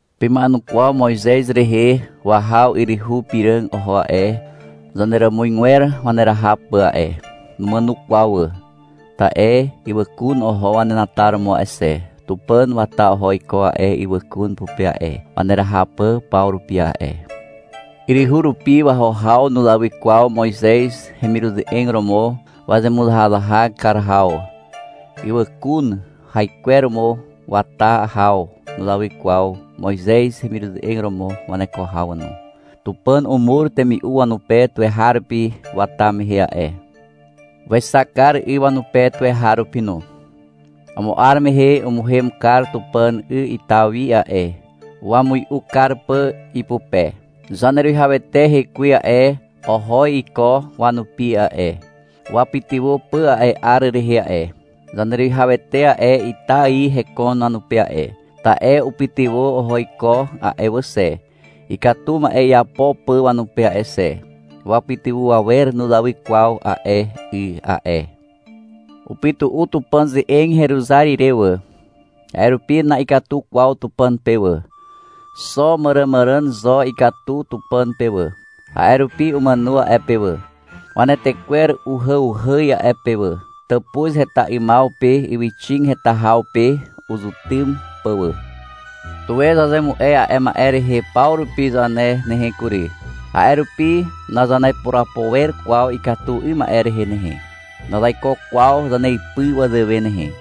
Pema'enukwaw Moizez rehe. Wahaw yryhu piràg oho a'e, zaneràmuzgwer waneraha pà a'e. Numàno kwaw wà, ta'e ywàkun oho wanenataromo a'e xe. Tupàn wata oho iko a'e ywàkun pupe a'e, waneraha pà paw rupi a'e. Yryhu rupi waho haw nuzawy kwaw Moizez hemiruze'eg romo wazemuzahazahak kar haw. Ywàkun haikweromo wata haw nuzawy kwaw Moizez hemiruze'eg romo waneko haw no. Tupàn umur temi'u wanupe tuweharupi wata mehe a'e. Wexak kar 'y wanupe tuweharupi no. Amo 'ar mehe umuhem kar Tupàn 'y ita wi a'e, wamui'u kar pà ipupe. Zaneruwihawete hekwe a'e, oho iko wanupi a'e, wapytywà pà a'e 'ar rehe a'e. Zaneruwihawete a'e ita ài hekon wanupe a'e, ta'e upytywà oho iko a'e wà xe, ikatu ma'e iapo pà wanupe a'e xe. Wapytywà awer nuzawy kwaw a'e 'y a'e. Upytu'u Tupàn ze'eg heruzar ire wà. A'e rupi na'ikatu kwaw Tupàn pe wà. Xo màràmàràn zo ikatu Tupàn pe wà. A'e rupi umàno a'e pe wà. Wanetekwer uhàuhàz a'e pe wà, tàpuz heta 'ymaw pe ywyxig heta haw pe uzetym pà wà. Tuwe zazemu'e a'e ma'e rehe paw rupi zane nehe kury. A'e rupi nazanepurapo wer kwaw ikatu 'ym ma'e rehe nehe. Nazaiko kwaw zaneipy wazàwe nehe.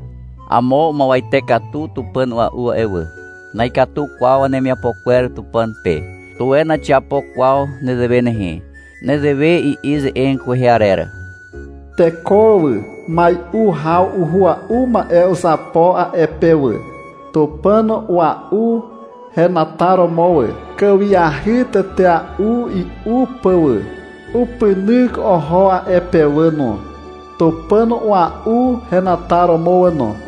Amo umuwete katu tupàn a'ua'u a'e wà. Na'ikatu kwaw wanemiapo kwer Tupàn pe. Tuwe naxiapo kwaw nezewe nehe. Nezewe i'i ze'eg kwehe arer. — Teko wà, mai'u haw uhua'u ma'e uzapo a'e pe wà, tupàn ua'u henataromo wà, kàwiahy tetea'u i'u pà wà. Upynyk oho a'e pe wà no, tupàn ua'u henataromo wà no.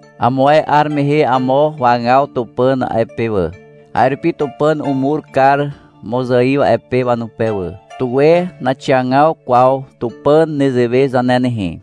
Amo ae 'ar mehe amo wagaw Tupàn a'e pe wà. A'e rupi Tupàn umur kar mozaiw a'e pe wanupe wà. Tuwe naxiagaw kwaw Tupàn nezewe zane nehe.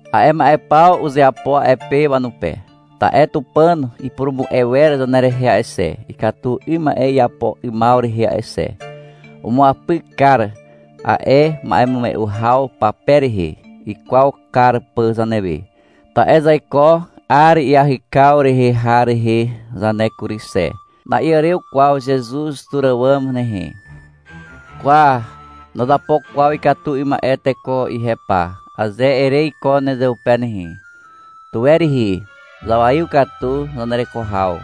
A'e ma'e paw uzeapo a'e pe wanupe, ta'e Tupàn ipurumu'e wer zanerehe a'e xe, ikatu 'ym ma'e iapo 'ymaw rehe a'e xe. Umuapyk kar a'e ma'emume'u haw pape rehe, ikwaw kar pà zanewe. Ta'e zaiko 'ar iahykaw rehe har rehe zane kury xe. Na'iàrew kwaw Zezuz tur àwàm nehe. — Kwa, nazapo kwaw ikatu 'ym ma'e teko ihe pa, aze ere iko nezeupe nehe, tuwe rihi. Zawaiw katu zanereko haw.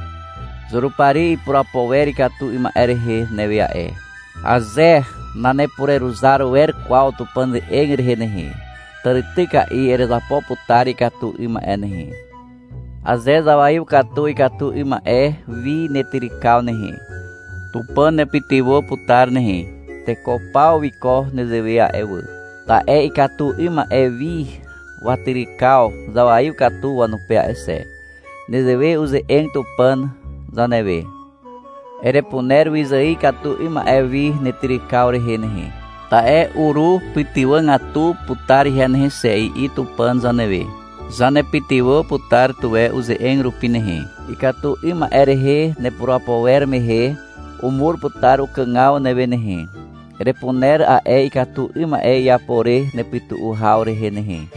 (Zurupari ipurapo wer ikatu 'ym ma'e rehe newe a'e.) Aze nanepureruzar wer kwaw Tupàn ze'eg rehe nehe, tàrityka'i erezapo putar ikatu 'ym ma'e nehe. Aze zawaiw katu ikatu 'ym ma'e wi netyrykaw nehe, Tupàn nepytywà putar nehe. Teko paw wiko nezewe a'e wà. Ta'e ikatu 'ym ma'e wi watyrykaw zawaiw katu wanupe a'e xe. Nezewe uze'eg Tupàn zanewe. — Erepuner wyzài ikatu 'ym ma'e wi netyrykaw rehe nehe, ta'e urupytywàgatu putar ihe nehe xe, i'i Tupàn zanewe. Zanepytywà putar tuwe uze'eg rupi nehe. Ikatu 'ym ma'e rehe nepurapo wer mehe, umur putar ukàgaw newe nehe. Erepuner a'e ikatu 'ym ma'e iapo re nepytu'u haw rehe nehe.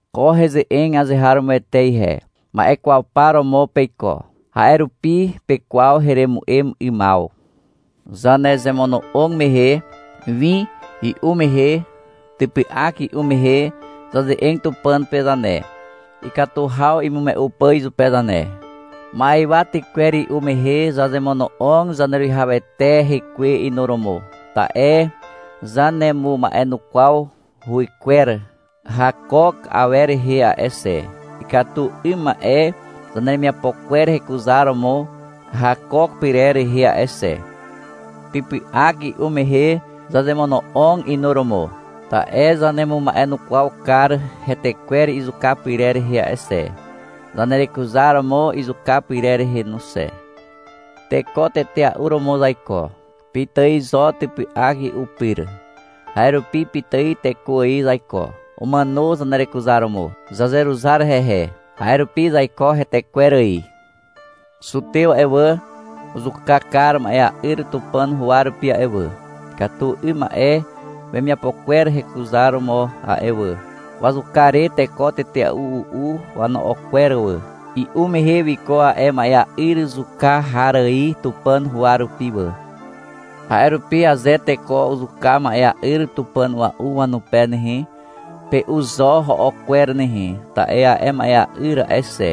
Ko heze'eg azeharomoete ihe. Ma'e kwaw par romo peiko. A'e rupi pekwaw heremu'em 'ymaw. Zanezemono'og mehe, win i'u mehe typy'ak i'u mehe, zaze'eg Tupàn pe zane, ikatu haw imume'u pà izupe zane. Ma'ywa tykwer i'u mehe zazemono'og Zaneruwihawete hekwe inuromo, ta'e zanemuma'enukwaw huwykwer hakook awer rehe a'e xe, ikatu 'ym ma'e zaneremiapo kwer hekuzaromo hakook pyrer rehe a'e xe. Typy'ak i'u mehe zazemono'og inuromo, ta'e zanemuma'enukwaw kar hetekwer izuka pyrer rehe a'e xe, zanerekuzaromo izuka pyrer rehe no xe. Teko tetea'u romo zaiko. Pitài zo typy'ak i'u pyr. A'e rupi pitài teko ài zaiko. Umàno zanerekuzaromo. Zazeruzar hehe. A'e rupi zaiko hetekwer ài. Zutew a'e wà, uzuka kar ma'ea'yr Tupàn huwa rupi a'e wà, ikatu 'ym ma'e wemiapo kwer hekuzaromo a'e wà. Wazuka re teko tetea'u u'u wano'o kwer wà. I'u mehe wiko a'e ma'ea'yr zuka har ài Tupàn huwa rupi wà. A'e rupi aze teko uzuka ma'ea'yr tupàn a'ua'u wanupe nehe, pe'u zo ho'o kwer nehe, ta'e a'e ma'ea'yr a'e xe,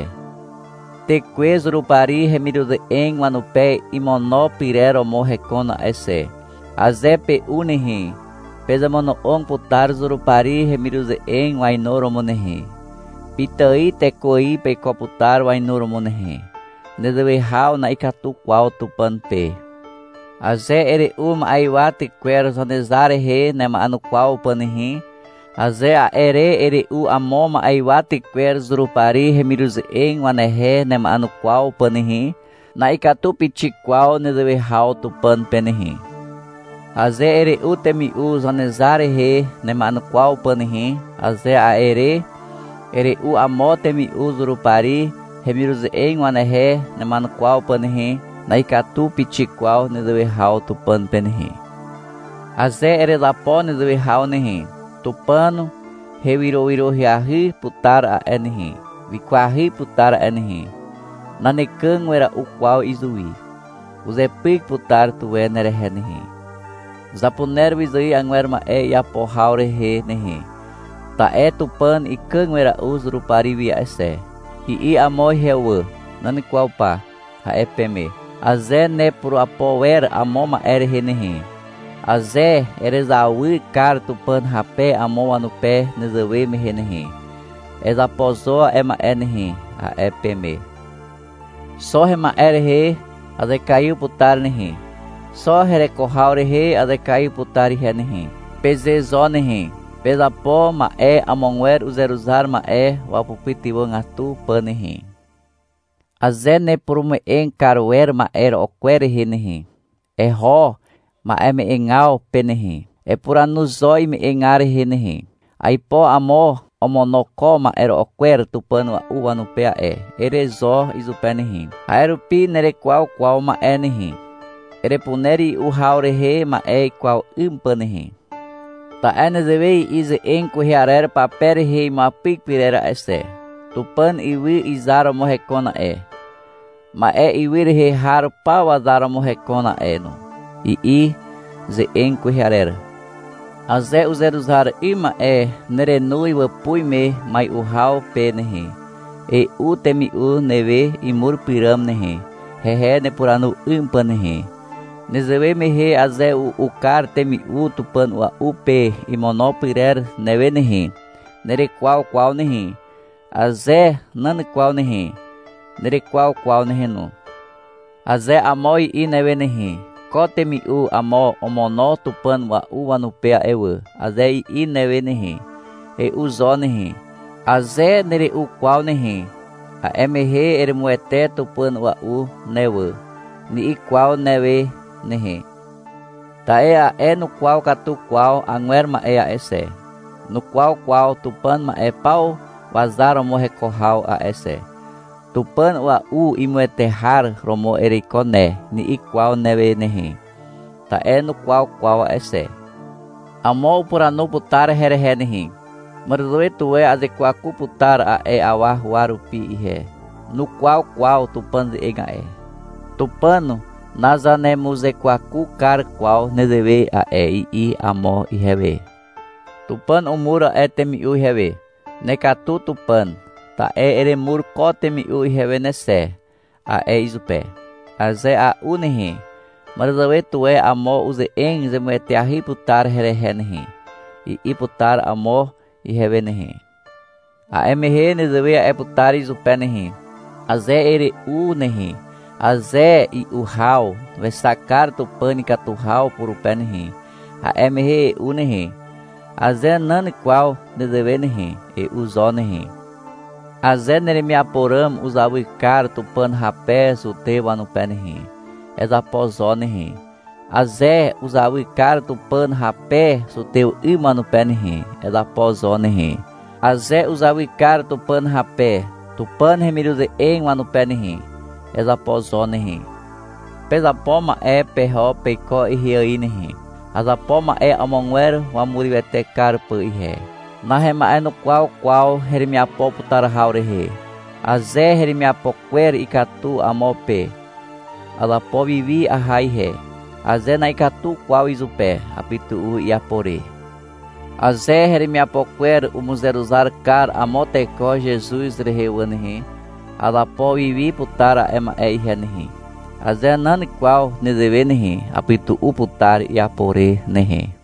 tekwe Zurupari hemiruze'eg wanupe imono pyrer romo hekon a'e xe. Aze pe'u nehe, pezemono'og putar Zurupari hemiruze'eg wainuromo nehe. Pitài teko ài peiko putar wainuromo nehe. Nezewe haw na'ikatu kwaw Tupàn pe. Aze ere'u ma'ywa tykwer Zanezar rehe nema'enukwaw pà nehe, aze a'e re ere'u amo ma'ywa tykwer Zurupari hemiruze'eg wanehe nema'enukwaw pà nehe, na'ikatu pixik kwaw nezewe haw Tupàn pe nehe. Aze ere'u temi'u Zanezar rehe nema'enukwaw pà nehe, aze a'e re ere'u amo temi'u Zurupari hemiruze'eg wanehe nema'enukwaw pà nehe, na'ikatu pixik kwaw nezewe haw Tupàn pe nehe. Aze erezapo nezewe haw nehe, Tupàn hewyrowyroahy putar a'e nehe, wikwahy putar a'e nehe. Nanekàg wera'u kwaw izuwi. Uzepyk putar tuwe nerehe nehe. — Zapuner wyzài agwer ma'e iapo haw rehe nehe, ta'e Tupàn ikàg wera'u Zurupari wi a'e xe, i'i amo ihewe wà. — Nan kwaw pa, a'e peme. Aze nepurapo wer amo ma'e rehe nehe, aze erezawy kar Tupàn hape amo wanupe nezewe mehe nehe, ezapo zo a'e ma'e nehe, a'e peme. — Xo hema'e rehe azekaiw putar nehe, xo hereko haw rehe azekaiw putar ihe nehe, peze zo nehe. Pezapo ma'e amogwer uzeruzar ma'e wapytywàgatu pà nehe. Aze nepurume'eg kar wer ma'e ro'o kwer rehe nehe, eho ma'eme'egaw pe nehe. Epuranu zo ime'egar rehe nehe. — Aipo amo omono ko ma'e ro'o kwer tupàn a'ua'u wanupe a'e, ere zo izupe nehe. A'e rupi nerekwaw kwaw ma'e nehe. Erepuner i'u haw rehe ma'e kwaw 'ym pà nehe. Ta'e nezewe i'i ze'eg kwehe arer pape rehe imuapyk pyrer a'e xe. — Tupàn ywy izar romo hekon a'e. Ma'e ywy rehe har paw wazar romo hekon a'e no, i'i ze'eg kwehe arer. Aze uzeruzar 'ym ma'e nerenoz wàpuz me mai'u haw pe nehe, e'u temi'u newe imur pyràm nehe, hehe nepuranu 'ym pà nehe. Nezewe mehe aze u'u kar temi'u tupàn a'ua'u pe imono pyrer newe nehe, nerekwaw kwaw nehe. Aze nan kwaw nehe, nerekwaw kwaw nehe no. Aze amo i'i newe nehe, — Ko temi'u amo omono tupàn a'ua'u wanupe a'e wà, aze i'i newe nehe, e'u zo nehe. Aze nere'u kwaw nehe, a'e mehe — Eremuwete tupàn a'ua'u ne wà, ni'i kwaw newe nehe. Ta'e a'e nukwaw katu kwaw agwer ma'e a'e xe, nukwaw kwaw Tupàn ma'e paw wazar romo heko haw a'e xe. — Tupàn a'ua'u imuwete har romo ereiko ne, ni'i kwaw newe nehe. Ta'e nukwaw kwaw a'e xe. Amo upuranu putar herehe nehe. -Màràzàwe tuwe azekwaku putar a'e awa huwa rupi ihe. Nukwaw kwaw Tupàn ze'eg a'e. Tupàn nazanemuzekwaku kar kwaw nezewe a'e, i'i amo ihewe. — Tupàn umur a'e temi'u ihewe. — Nekatu Tupàn, ta'e eremur ko temi'u ihewe ne xe, a'e izupe. Aze a'u nehe, màràzàwe tuwe amo uze'eg zemueteahy putar herehe nehe, i'i putar amo ihewe nehe. A'e mehe nezewe a'e putar izupe nehe. Aze ere'u nehe, aze i'u haw wexak kar Tupàn ikatu haw purupe nehe, a'e mehe e'u nehe. Aze nan kwaw nezewe nehe, e'u zo nehe. Aze neremiapo ràm uzawy kar Tupàn hape zutew wanupe nehe, ezapo zo nehe. Aze uzawy kar Tupàn hape zutew 'ym wanupe nehe, ezapo zo nehe. Aze uzawy kar Tupàn hape Tupàn hemiruze'eg wanupe nehe, ezapo zo nehe. Pezapo ma'e peho peiko ihe ài nehe. Azapo ma'e amogwer wamurywete kar pà ihe. Nahema'enukwaw kwaw heremiapo putar haw rehe. Aze heremiapo kwer ikatu amo pe, azapo wiwi aha ihe. Aze na'ikatu kwaw izupe, apytu'u iapo re. Aze heremiapo kwer umuzeruzar kar amo teko Zezuz rehe wà nehe, azapo wiwi putar a'e ma'e ihe nehe. Aze nan kwaw nezewe nehe, apytu'u putar iapo re nehe.